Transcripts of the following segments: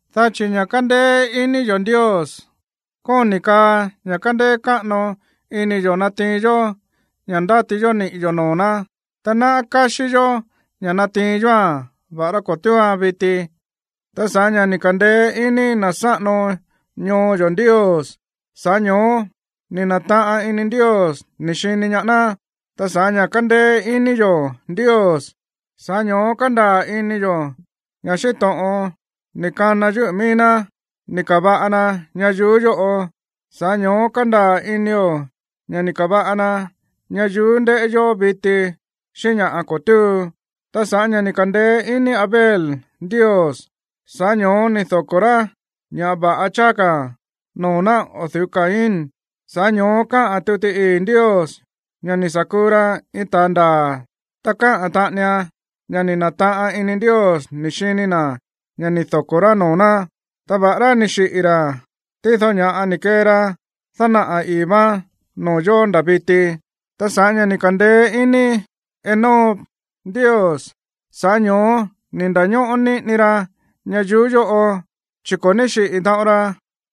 Dá chi̱ ña̱ kándéé iní yo̱ Ndios kóni̱ kaa ña̱ kándéé káꞌano ini yo̱ natiin yó ña̱ ndáti yó niꞌi̱ yo̱ noo̱ ná. Ta náꞌá káxí yó ña̱ natiin yóa̱n, va̱ꞌará ko̱ túuan viti. Ta sa̱ꞌá ña̱ ni̱ ka̱ndeé iní na̱ sáꞌano ñoo yo̱ Ndios, sa̱ꞌá ño̱ó ni̱ na̱taꞌan ini Ndios ni̱ xini ñaá ná. Ta sa̱ꞌá ña̱ kándéé iní yo̱ Ndios, sa̱ꞌá ño̱ó kándaa̱ ini yo̱ ña̱ xíꞌín to̱ꞌon ni̱ kana yúꞌu̱ mií ná ni̱ ka̱va̱ꞌa na ñayuú yóꞌo, sa̱ꞌá ño̱ó kándaa̱ inio̱ ña̱ ni̱ ka̱va̱ꞌa na ñayuú ndéꞌé yó viti xíꞌín ña̱ꞌa ko̱ túu. Ta sa̱ꞌá ña̱ ni̱ ka̱ndeé iní Abel Ndios, sa̱ꞌá ño̱ó ni̱ doko̱ rá ña̱ va̱ꞌa cháá ka̱ noo̱ ná o̱ du̱ú Caín, sa̱ꞌá ño̱ó kaá tuti ii̱ Ndios ña̱ ni̱ sa̱ kuu ra iin ta̱a ndaa̱, ta kaá taꞌanian ña̱ ni̱ na̱taꞌan ini Ndios ni̱ xini na̱ ña̱ ni̱ doko̱ rá noo̱ ná. Ta va̱ꞌará ni̱ xiꞌi̱ ra̱, tído ña̱ꞌa ni̱ kee ra dánaꞌa̱ ii̱ váán noo̱ yo̱ nda̱ viti. Ta sa̱ꞌá ña̱ ni̱ ka̱ndeé iní Enoc Ndios, sa̱ꞌá ño̱ó ni̱ nda̱ñóꞌó níꞌini ra ñayuú yóꞌo, chi̱ ko̱ ní xiꞌi̱ taꞌon ra,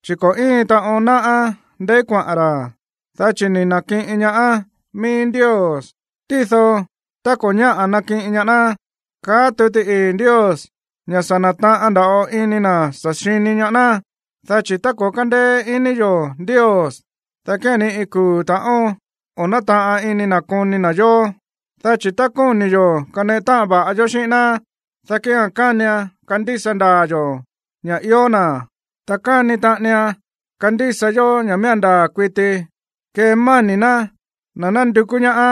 chi̱ ko̱ íin taꞌon náꞌá ndeí kuaꞌa̱n ra̱, dá chi̱ ni̱ na̱kiꞌin ñaá mií Ndios. Tído tá ko̱ ñáꞌa̱ nakiꞌin ñaá ná, kaá tuti ii̱ Ndios ña̱ sa̱ na̱taꞌan nda̱ꞌo ini na̱ sa̱ xini ñaá ná. Dá chi̱ tá ko̱ kándeé iní yo̱ Ndios, dá kía̱n ni iin kuu̱ ta̱ꞌón o̱ nátaꞌan ini na̱ koni na̱ yó. Dá chi̱ tá kóni̱ yo̱ kaneꞌe táꞌan va̱ꞌa yó xíꞌín ná, dá kía̱n kánian kandísa ndaa̱ yo̱ ña̱ ió na̱, ta káni taꞌanian kandísa yó ña̱ miía̱n ndaa̱ kuiti kemáni̱ ná na̱ nándukú ñaá.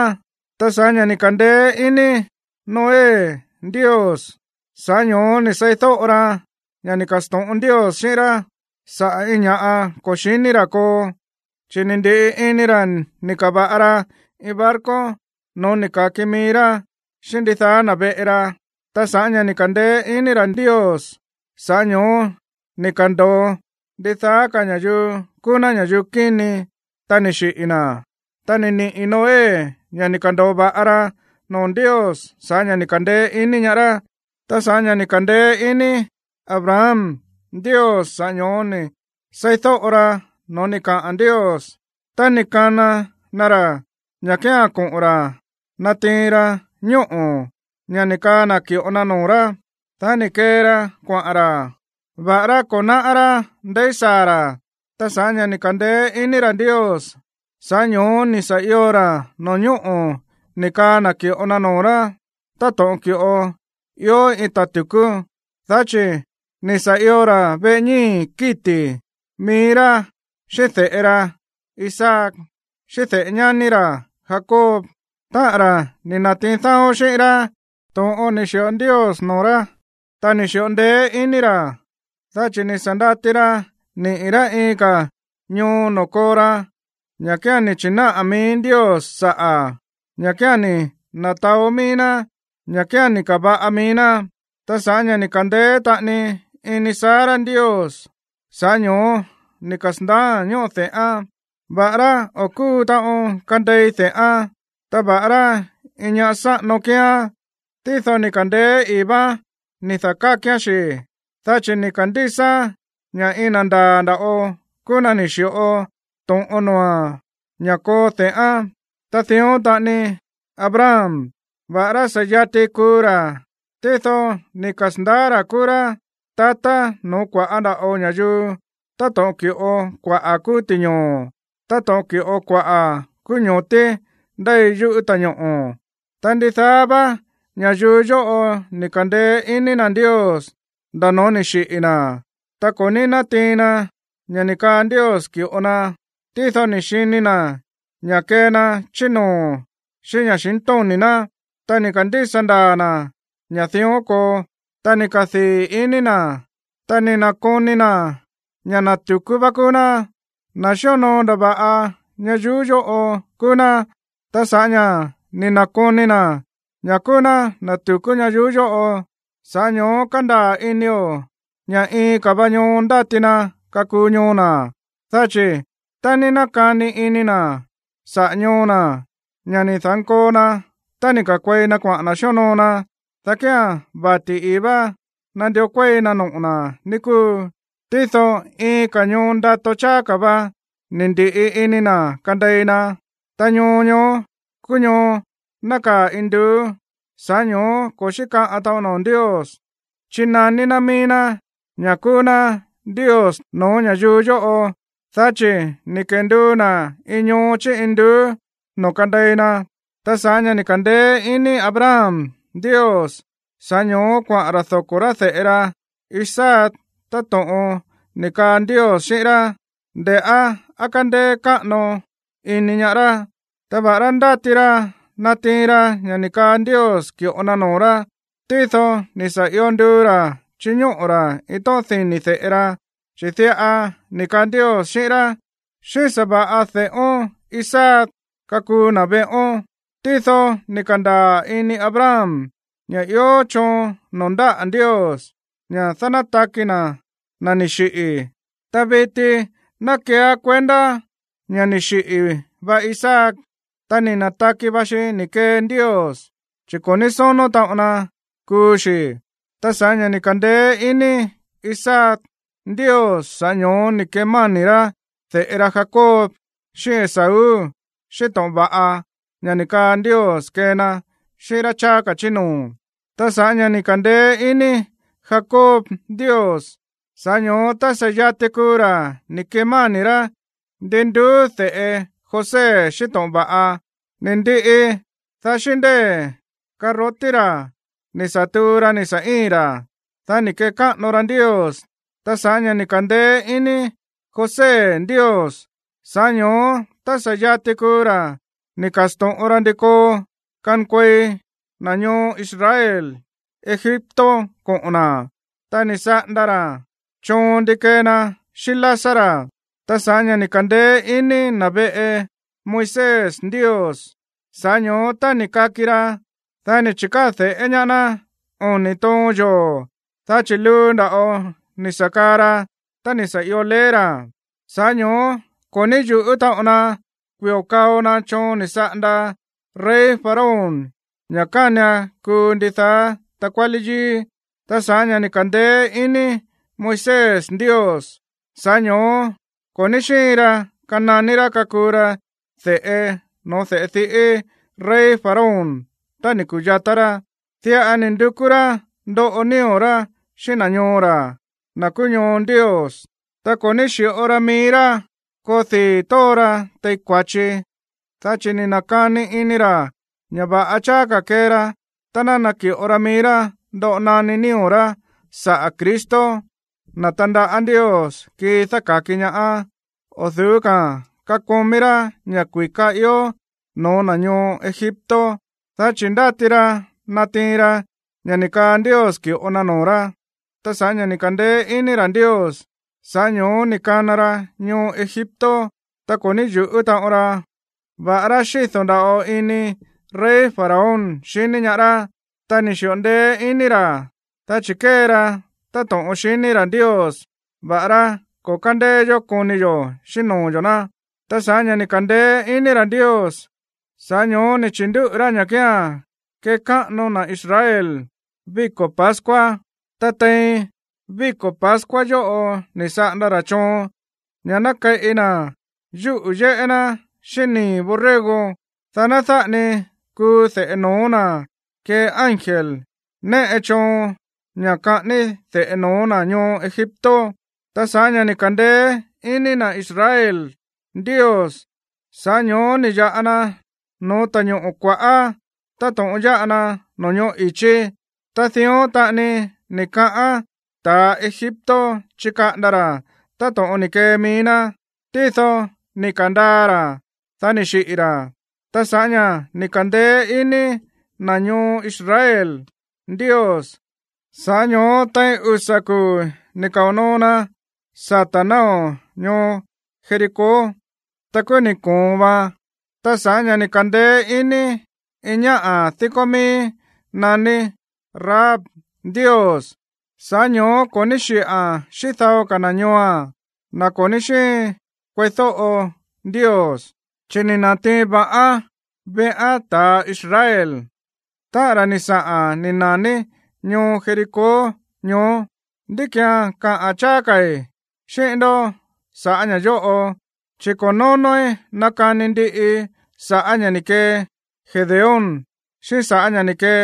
Ta sa̱ꞌá ña̱ ni̱ ka̱ndeé iní Noé Ndios, sa̱ꞌá ño̱ó ni̱ seídóꞌo ra ña̱ ni̱ ka̱sto̱ꞌon Ndios xíꞌín rá sa̱ꞌá iin ña̱ꞌa ko̱ xi̱ní ra̱ koo, chi̱ ni̱ ndi̱ꞌi ini ra̱ ni̱ ka̱va̱ꞌa ra iin barco no̱ó ni̱ ka̱ki mií rá xíꞌín ndidaá na̱ veꞌe ra. Ta sa̱ꞌá ña̱ ni̱ ka̱ndeé iní ra̱ Ndios, sa̱ꞌá ño̱ó ni̱ ka̱ndo̱o ndidaá ka̱ ña̱yuu kúú ná ña̱yuu kíni, ta ni̱ xiꞌi̱ na̱, ta ni̱ niꞌi̱ Noé ña̱ ni̱ ka̱ndo̱o va̱ꞌa ra noo̱ Ndios sa̱ꞌá ña̱ ni̱ ka̱ndeé iní ñaá rá. Ta sa̱ꞌá ña̱ ni̱ ka̱ndeé iní Abraham Ndios, sa̱ꞌá ño̱ó ni̱ seídóꞌo ra no̱ó ni̱ kaꞌa̱n Ndios tá ni̱ kana na ra̱ ña̱ kía̱n koꞌo̱n ra̱ natiin ra ñóꞌo̱, ña̱ ni̱ kaa na̱ ki̱ꞌo na noo̱ rá. Dá ni̱ kee ra kuaꞌa̱n ra̱, va̱ꞌará ko̱ náꞌá rá ndeí saa̱ ra̱. Ta sa̱ꞌá ña̱ ni̱ ka̱ndeé iní ra̱ Ndios, sa̱ꞌá ño̱ó ni̱ sa̱ io ra̱ no̱ñóꞌo̱ ni̱ kaa na̱ ki̱ꞌo na noo̱ rá táto̱ꞌon ki̱ꞌo ió iin ta̱ tu̱kú, dá chi̱ ni̱ sa̱ io ra̱ veꞌe ñíi̱ kíti̱, mií rá xíꞌín de̱ꞌe ra Isaac, xíꞌín de̱ꞌe ñání ra̱ Jacob, táꞌa̱n ra̱ ni̱ na̱tiin dáó xíꞌín rá to̱ꞌon ni̱ xi̱ꞌo Ndios noo̱ rá. Ta ni̱ xi̱ꞌo ndeé iní ra̱, dá chi̱ ni̱ sa̱ ndati ra niꞌi̱ rá iin ka̱ va ñoo noo̱ koo ra, ña̱ kía̱n ni̱ chi̱náꞌa̱ mií Ndios saꞌa̱, ña̱ kía̱n ni̱ na̱taó mií ná, ña̱ kía̱n ni̱ ka̱va̱ꞌa mií ná. Ta sa̱ꞌá ña̱ ni̱ ka̱ndeé taꞌani iní Sara Ndios, sa̱ꞌá ño̱ó ni̱ kasa̱ndaáa̱n ñóꞌo de̱ꞌán, va̱ꞌará o̱ kúu taꞌon kandei de̱ꞌán. Ta va̱ꞌará iin ñá sáꞌano kíán, tído ni̱ ka̱ndeé ii̱ váán ni̱ da̱kákián xi̱, dá chi̱ ni̱ ka̱ndísaán ña̱ iin na̱ ndaa̱ nda̱ꞌo kúú na̱ ni̱ xi̱ꞌo to̱ꞌon noo̱a̱n ña̱ koo de̱ꞌán. Ta dión taꞌani Abraham, va̱ꞌará sa̱ yati kuu ra̱, tído ni̱ kasa̱ndaá ra̱ kúú rá tatá no̱ó kua̱ꞌá nda̱ꞌo ña̱yuu táto̱ꞌon ki̱ꞌo kuaꞌa̱ kúú ti̱ñoo̱, táto̱ꞌon ki̱ꞌo kuaꞌa̱ kúú ño̱tí ndéi yúꞌu̱ ta̱ñoꞌo̱. Ta ndidaá vá ña̱yuu yóꞌo ni̱ ka̱ndeé iní na̱ Ndios nda̱ no̱ó ni̱ xiꞌi̱ na̱. Ta ko̱ ní nátiin na ña̱ ni̱ kaa Ndios ki̱ꞌo na, tído ni̱ xini na̱ ña̱ kee na chí noo̱ xíꞌín ña̱xintóni̱ ná. Ta ni̱ ka̱ndísa ndaa̱ na̱ ña̱ dión koo, ta ni̱ kadii̱ ini na̱. Ta ni̱ na̱koni na̱ ña̱ na̱ tu̱kú vá kúú ná, na̱ xíonoo ndava̱ꞌa ñayuú yóꞌo kúú ná. Ta sa̱ꞌá ña̱ ni̱ na̱koni na̱ ña̱ kúú ná na̱ tu̱kú ñayuú yóꞌo, sa̱ꞌá ño̱ó kándaa̱ inio̱ ña̱ iin ka̱ va ñoo ndáti na kakuu ñoo na̱. Dá chi̱ tá ní nákani ini na̱ saꞌa̱ ñoo na̱, ña̱ ni̱ da̱nkoo na tá ni̱ ka̱nkuei na xíonoo na, dá kía̱n vati̱ ii̱ vá nandió kuéi na noꞌo̱ na̱, ní kúu. Tído iin ka̱ ñoo ndato cháá ka̱ va ni̱ ndi̱ꞌi ini na̱ kandei na, ta ñoo ñoó kúú ñoo nákaa̱ induú. Sa̱ꞌá ño̱ó ko̱ xíkaꞌan taꞌon noo̱ Ndios chínaní ná mií ná ña̱ kúú ná Ndios no̱ó ña̱yuu yóꞌo, dá chi̱ ni̱ kenduu na̱ iin ñoo chí induú noo̱ kandei na. Ta sa̱ꞌá ña̱ ni̱ ka̱ndeé iní Abraham Ndios, sa̱ꞌá ño̱ó kuaꞌa̱n ra̱ doko̱ rá de̱ꞌe ra Isaac táto̱ꞌon ni̱ kaa Ndios xíꞌín rá, nde̱ꞌá á kándéé káꞌano iní ñaá rá. Ta va̱ꞌará ndáti ra natiin ra ña̱ ni̱ kaa Ndios ki̱ꞌo na noo̱ rá, tído ni̱ sa̱ io nduu ra̱ chiñóꞌo̱ ra̱ iin tóꞌón dini̱ de̱ꞌe ra, chi̱ diꞌa ni̱ kaa Ndios xíꞌín rá: “Xíꞌín sa̱va̱ꞌa de̱ꞌón Isaac kakuu na̱ veꞌón.” Tído ni̱ ka̱ndaa̱ ini Abraham ña̱ ió choon noo̱ ndáꞌa̱ Ndios ña̱ dánátaki na̱ na̱ ni̱ xiꞌi̱. Ta viti ná keeá kuendá ña̱ ni̱ xiꞌi̱ va Isaac, ta ni̱ na̱taki va xi ni̱ kee Ndios, chi̱ ko̱ ní sónó taꞌon na kuu xi̱. Ta sa̱ꞌá ña̱ ni̱ ka̱ndeé iní Isaac Ndios, sa̱ꞌá ño̱ó ni̱ kemáni̱ rá de̱ꞌe ra Jacob xíꞌín Esaú xíꞌín to̱ꞌon va̱ꞌa, ña̱ ni̱ kaa Ndios kee na xíꞌín rá cháá ka̱ chí noo̱. Ta sa̱ꞌá ña̱ ni̱ ka̱ndeé iní Jacob Ndios, sa̱ꞌá ño̱ó tá sa̱ yati kuu ra̱ ni̱ kemáni̱ rá ndin nduú de̱ꞌe José xíꞌín to̱ꞌon va̱ꞌa. Ni̱ ndiꞌi, dá xíꞌín ndée̱ karrotí ra̱ ni̱ sa̱ tuu ra ni̱ sa̱ íi̱n ra̱, dá ni̱ kekáꞌano ra Ndios. Ta sa̱ꞌá ña̱ ni̱ ka̱ndeé iní José Ndios, sa̱ꞌá ño̱ó tá sa̱ yati kuu ra̱ ni̱ ka̱sto̱ꞌon ra ndi koo kankuei na̱ ñoo Israel Egipto koꞌo̱n na̱, ta ni̱ saꞌanda ra̱ choon ndi kee na xíꞌín lásá ra̱. Ta sa̱ꞌá ña̱ ni̱ ka̱ndeé iní na̱ veꞌe Moisés Ndios, sa̱ꞌá ño̱ó tá ni̱ kaki ra, dá ni̱ chi̱káa̱ de̱ꞌé ñaá ná oni̱ toon yoo̱, dá chi̱ luu nda̱ꞌo ni̱ sa̱ kaa ra tá ni̱ sa̱ io leé ra̱. Sa̱ꞌá ño̱ó ko̱ ní yu̱ꞌú taꞌon na kui̱o kao na choon ni̱ saꞌanda rey Faraón ña̱ kánian kuu ndidaá takuálí yíí. Ta sa̱ꞌá ña̱ ni̱ ka̱ndeé iní Moisés Ndios, sa̱ꞌá ño̱ó ko̱ ní xíin ra kananí rá kakuu ra de̱ꞌe no̱ó de̱ꞌe diꞌí rey Faraón tá ni̱ ku̱yatá rá. Diꞌa ni̱ ndukú rá ndoꞌo nío̱ rá xíꞌín na̱ ñoo ra̱, na̱ kúú ñoo Ndios, ta ko̱ ní xi̱ꞌo ra mií rá koo dii̱ tóo ra tein kua̱chi. Dá chi̱ ni̱ na̱kani ini ra̱ ña̱ va̱ꞌa cháá ka̱ kee ra tá ná naki̱ꞌo ra mií rá ndoꞌo naní nío̱ rá saꞌa̱ Cristo, na̱ tandaꞌá Ndios kii dáka̱ki ñaá, o̱ du̱ú ka̱a̱n kakomí rá ña̱ kui̱ká ió no̱ó na̱ ñoo Egipto, dá chi̱ ndáti ra natiin ra ña̱ ni̱ kaa Ndios ki̱ꞌo na noo̱ rá. Ta sa̱ꞌá ña̱ ni̱ ka̱ndeé iní ra̱ Ndios, sa̱ꞌá ño̱ó ni̱ kana ra ñoo Egipto, ta ko̱ ní yu̱ꞌú taꞌon ra, va̱ꞌará xído̱ nda̱ꞌo ini rey Faraón xiní ñaá rá. Ta ni̱ xi̱ꞌo ndeé iní ra̱, dá chi̱ kée ra táto̱ꞌon xiní ra̱ Ndios, va̱ꞌará ko̱ kándeé yó koni xíꞌín noo̱ yo̱ ná. Ta sa̱ꞌá ña̱ ni̱ ka̱ndeé iní ra̱ Ndios, sa̱ꞌá ño̱ó ni̱ chi̱ndúꞌu̱ rá ña̱ kía̱n kekáꞌano na̱ Israel víko̱ pascua. Ta tein víko̱ pascua yóꞌo ni̱ saꞌanda ra̱ choon ña̱ ná keꞌi na̱ yúꞌu̱ yéꞌé ná xíꞌín nii̱ borrego, dá ná dáꞌa ni kuu de̱ꞌe no̱ó na̱ kee ángel néꞌe choon ña̱ kaꞌání de̱ꞌe no̱ó na̱ ñoo Egipto. Ta sa̱ꞌá ña̱ ni̱ ka̱ndeé iní na̱ Israel Ndios, sa̱ꞌá ño̱ó ni̱ ya̱ꞌa na no̱ó Ta̱ñoꞌo̱ Kua̱ꞌá táto̱ꞌon yáꞌa na no̱ñóꞌo̱ i̱chí. Ta dión taꞌani ni̱ kaꞌán ta̱ Egipto chikaꞌanda ra̱ táto̱ꞌon ni̱ kee mií ná, tído ni̱ ka̱ndaa ra̱, dá ni̱ xiꞌi̱ ra̱. Ta sa̱ꞌá ña̱ ni̱ ka̱ndeé iní na̱ ñoo Israel Ndios, sa̱ꞌá ño̱ó tein usa̱ kuu̱ ni̱ kao̱ noo na sata̱ náo̱ ñoo Jericó, ta kúú ni̱ ko̱on vaan. Ta sa̱ꞌá ña̱ ni̱ ka̱ndeé iní iin ñáꞌa̱ díkó míí naní Rahab Ndios, sa̱ꞌá ño̱ó ko̱ ní xiꞌa̱n xíꞌín dao ka̱ na̱ ñooa̱n, na̱ ko̱ ní xíin kueídóꞌo Ndios, chi̱ ni̱ na̱tiin va̱ꞌán veꞌán ta̱a Israel, táꞌa̱n ra̱ ni̱ saꞌa̱n ni̱ na̱ní ñoo Jericó ñoó. ¿Ndí ki̱án kaꞌa̱n cháá ka̱i̱ xíꞌín ndó sa̱ꞌá ña̱ yóꞌo? Chi̱ ko̱ nónóí nakani ndiꞌii sa̱ꞌá ña̱ ni̱ kee Gedeón, xíꞌín sa̱ꞌá ña̱ ni̱ kee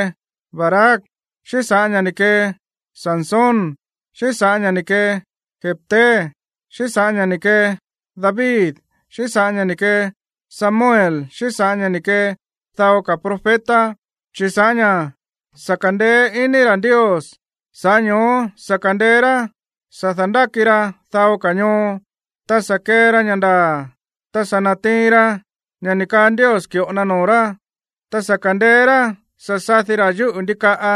Barac, xíꞌín sa̱ꞌá ña̱ ni̱ kee Sansón, xíꞌín sa̱ꞌá ña̱ ni̱ kee Jefté, xíꞌín sa̱ꞌá ña̱ ni̱ kee David, xíꞌín sa̱ꞌá ña̱ ni̱ kee Samuel xíꞌín sa̱ꞌá ña̱ ni̱ kee dao ka̱ profeta, chi̱ sa̱ꞌá ña̱ sa̱ ka̱ndeé iní ra̱ Ndios, sa̱ꞌá ño̱ó sa̱ ka̱ndeé rá sa̱ da̱ndáki ra dao ka̱ ñoo, ta sa̱ kee ra ña̱ ndaa̱, ta sa̱ na̱tiin ra ña̱ ni̱ kaa Ndios ki̱ꞌo na noo̱ rá, ta sa̱ ka̱ndeé rá sa̱ sadi ra̱ yúꞌu̱ ndikaꞌa,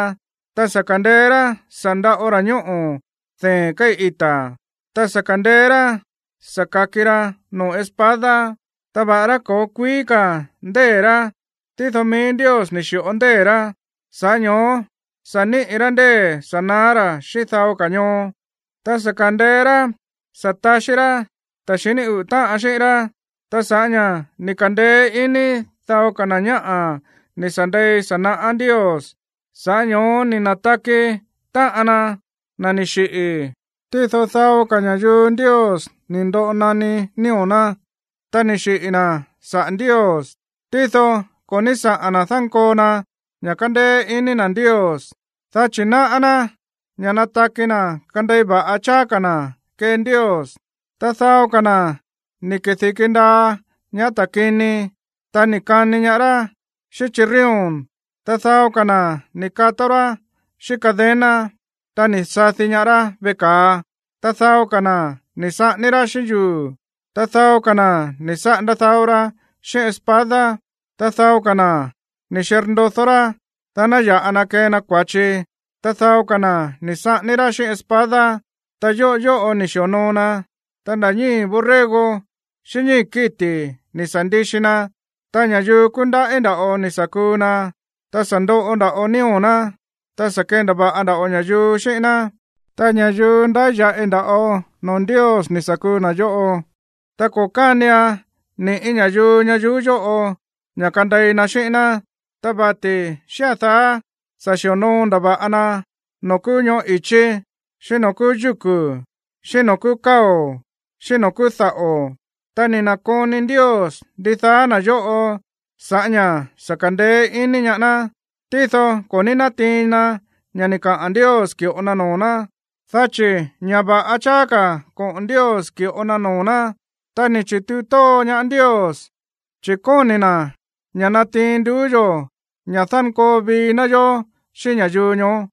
ta sa̱ ka̱ndeé rá sa̱ ndaꞌo ra̱ ñóꞌo̱ dee̱n kéi̱ ita̱, ta sa̱ ka̱ndeé rá sa̱ ka̱ki ra noo̱ espada. Ta va̱ꞌará ko̱ kuíí ka̱ ndée̱ rá, tído mií Ndios ni̱ xi̱ꞌo ndée̱ rá, sa̱ꞌá ño̱ó sa̱ níꞌi̱ rá ndée̱ sa̱ na̱á ra̱ xíꞌín dao ka̱ ñoo, ta sa̱ ka̱ndeé rá sa̱ taxí rá ta̱ xiní uꞌu̱ táꞌan xíꞌín rá. Ta sa̱ꞌá ña̱ ni̱ ka̱ndeé iní dao na̱ ñáꞌa̱ ni̱ sa̱ ndei sa̱ naꞌá Ndios, sa̱ꞌá ño̱ó ni̱ na̱taki táꞌan na, na̱ ni̱ xiꞌi̱. Tído dao ka̱ ña̱yuu Ndios ni̱ ndoꞌo naní nío̱ ná, ta ni̱ xiꞌi̱ na̱ saꞌa̱ Ndios, tído ko̱ ní saꞌa̱n na̱ dánkoo na ña̱ kándéé iní na̱ Ndios, dá chi̱ náꞌá ná ña̱ nataki na̱ kandei va̱ꞌa cháá ka̱ na̱ kee Ndios. Ta dao ka̱ na̱ ni̱ kedi̱ki ndaa ñaá ta̱ kini, ta ni̱ kani ñaá rá xíꞌín chirrión, ta dao ka̱ na̱ ni̱ kató rá xíꞌín cadena, ta ni̱ sadi ñaá rá veꞌe ka̱a. Ta dao ka̱ na̱ ni̱ saꞌání rá xíꞌín yuu̱, ta dao ka̱ na̱ ni̱ saꞌanda dao ra xíꞌín espada, ta dao ka̱ na̱ ni̱ xirndodó rá, dá ná ya̱ꞌa na kee na kua̱chi, ta dao ka̱ na̱ ni̱ saꞌání rá xíꞌín espada. Ta yóꞌo yóꞌo ni̱ xi̱onoo na, ta nda̱ ñíi̱ borrego xíꞌín ñíi̱ kíti̱ ni̱ sa̱ ndixi na. Ta ña̱yuu kúndaꞌí nda̱ꞌo ni̱ sa̱ kuu na, ta sa̱ ndoꞌo nda̱ꞌo nío̱ ná, ta sa̱ kendava̱ꞌa nda̱ꞌo ña̱yuu xíꞌín ná. Ta ña̱yuu ndáya̱ꞌi nda̱ꞌo noo̱ Ndios ni̱ sa̱ kuu na̱ yóꞌo, ta ko̱ kánian ni̱ꞌí ña̱yuu ñayuú yóꞌo ña̱ kandei na xíꞌín ná, ta vati̱ xía̱n daá sa̱ xi̱onoo ndava̱ꞌa na noo̱ kúú ñoꞌó i̱chí, xíꞌín noo̱ kúú yúku̱, xíꞌín noo̱ kúú káo̱, xíꞌín noo̱ kúú daꞌo̱. Ta ni̱ na̱koni Ndios ndidaá na̱ yóꞌo sa̱ꞌá ña̱ sa̱ ka̱ndeé iní ñaá ná, tído ko̱ ní nátiin na ña̱ ni̱ kaa Ndios ki̱ꞌo na noo̱ ná, dá chi̱ ña̱ va̱ꞌa cháá ka̱ koꞌo̱n Ndios ki̱ꞌo na noo̱ ná, ta ni̱ chi̱tuu tóo ña̱ Ndios, chi̱ kóni̱ na̱ ña̱ natiin nduú yo̱ ña̱ dánkoo vii ná yó xíꞌín ña̱yuu ñoó.